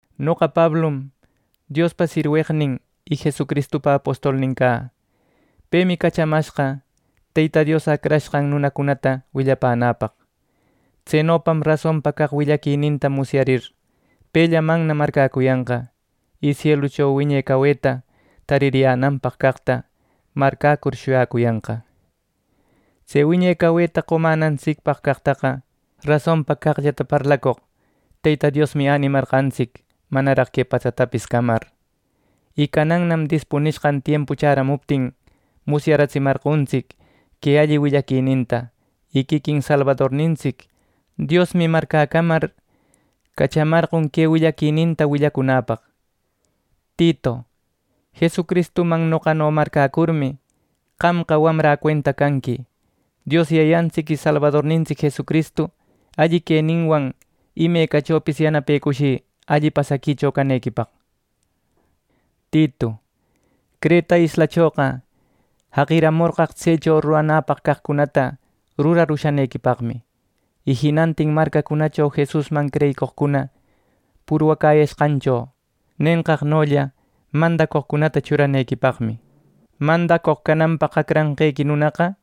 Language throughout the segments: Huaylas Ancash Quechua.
Noqa Pablum Diospa sirweqnin y Jesucristupa apostolnin cä. Pemi cachamashqa Teyta Dios acrashqan nunacunata willapänäpaq. Tsenopam rasonpa caq willaquininta musyarir, pellamanna marcäcuyanqa, y sielucho wiñe caweta taririyänanpaq caqta marcäcur shuyacuyanqa. Tse wiñe caweta qomänantsicpaq caqtaqa rasonpa caqllata parlacoq Teyta Diosmi änimarqantsic manaraq que patsatapis camar. Y canannam dispunishqan tiempu chäramuptin musyaratsimarqontsic que alli willaquininta. Y quiquin Salbadornintsic Diosmi marcäcamar cachamarqon que willaquininta willacunäpaq. Titu, Jesucristuman noqano marcäcurmi, qamqa wamrä cuenta canqui. Dios Yayantsic y salbadornintsic Jesucristu alli queninwan imecachopis yanapecushï alli pasaquicho canequipaq. Titu, Creta islachoqa jaqimorqaq tsecho ruranäpaq caqcunata rurar ushanequipaqmi, y jinantin marcacunacho Jesusman creyicoqcuna purwacäyashqancho nenqaqnolla mandacoqcunata churanequipaqmi. Mandacoq cananpaq acranqequi nunaqa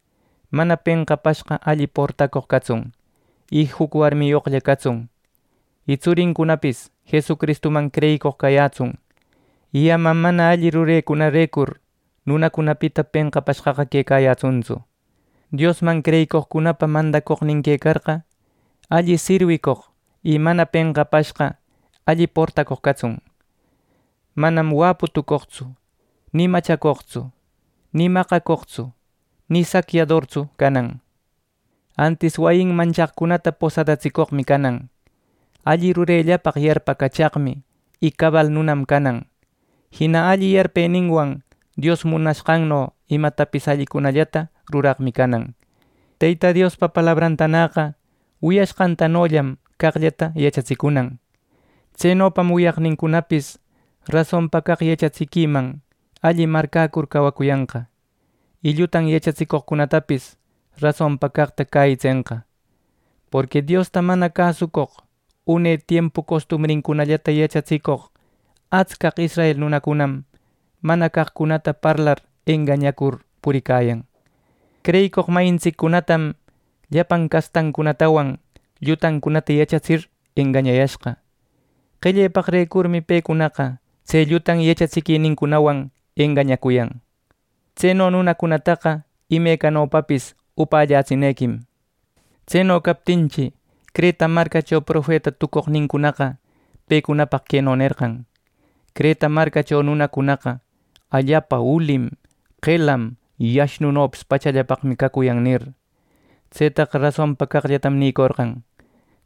mana penqapashqa alli portacoq catsun; y juc warmiyoqlla catsun; y tsurincunapis Jesucristuman creyicoq cayätsun; y ama mana alli rurenincunarecur nunacunapita penqapashqa quecayätsuntsu. Diosman creyicoqcunapa mandacoqnin quecarqa, alli sirwicoq y mana penqapashqa alli portacoq catsun. Manam wäpu tucoqtsu, ni machacoqtsu, ni maqacoqtsu, ni sacyadortsu canan. Antis, wayinman chaqcunata posadatsicoqmi canan. Alli rurellapaq yarpacachaqmi, y cabal nunam canan. Jina alli yarpeninwan Dios munashqanno imatapis allicunallata ruraqmi canan. Teyta Diospa palabrantanäqa wiyashqantanollam caqllata yachatsicunan. Tsenopam wiyaqnincunapis rasonpa caq yachatsiquiman alli marcäcur cawacuyanqa, y llutan yachatsicoqcunatapis rasonpa caqta cäyitsenqa. Porqui Diosta mana cäsucoq une tiempu costumbrincunallata yachatsicoq atscaq israel nunacunam mana caqcunata parlar engañacur puricayan. Creyicoq mayintsiccunatam llapan castancunatawan llutancunata yachatsir engañayashqa. Qellepaqrecurmi pecunaqa tse llutan yachatsiquinincunawan engañacuyan. Tseno nunacunataqa imecanopapis upällätsinequim. Tseno captinchi, Creta marcacho profeta tucoqnincunaqa pecunapaq queno nerqan: “Creta marcacho nunacunaqa allapa ulim, qelam y ashnunopis pachallapaqmi cacuyan” nir. Tsetaqa rasonpa caqllatam nïcorqan.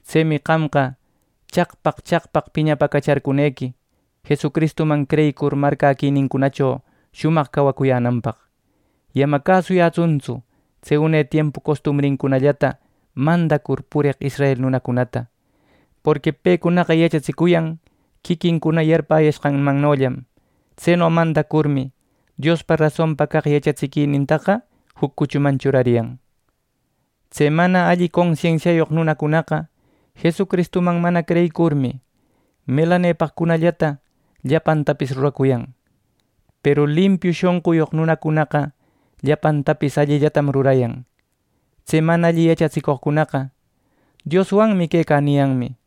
Tsemi qamqa chaqpaq chaqpaq piñapäcacharcunequi, Jesucristuman creyicur marcäquinincunacho shumaq cawacuyänanpaq. Y ama cäsuyätsuntsu tse une tiempu costumbrincunallata mandacur pureq israel nunacunata. Porqui pecunaqa yachatsicuyan quiquincuna yarpäyashqanmannollam. Tseno mandacurmi, Diospa rasonpa caq yachatsiquinintaqa juc cuchuman churariyan. Tse mana alli consensiayoq nunacunaqa Jesucristuman mana creyicurmi, melanepaqcunallata llapantapis ruracuyan, peru limpiu shonquyoq nunaqa llapantapis allillatam rurayan. Tse mana alli yachatsicoqcuna “Dioswanmi quecä” niyanmi;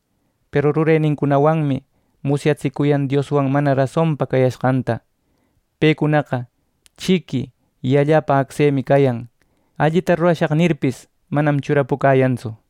peru rurenincunawanmi musyatsicuyan Dioswan mana rasonpa cayashqanta. Pecunaqa chiqui y allapa acsemi cayan. “Allita rurashaq” nirpis, manam churapucäyantsu.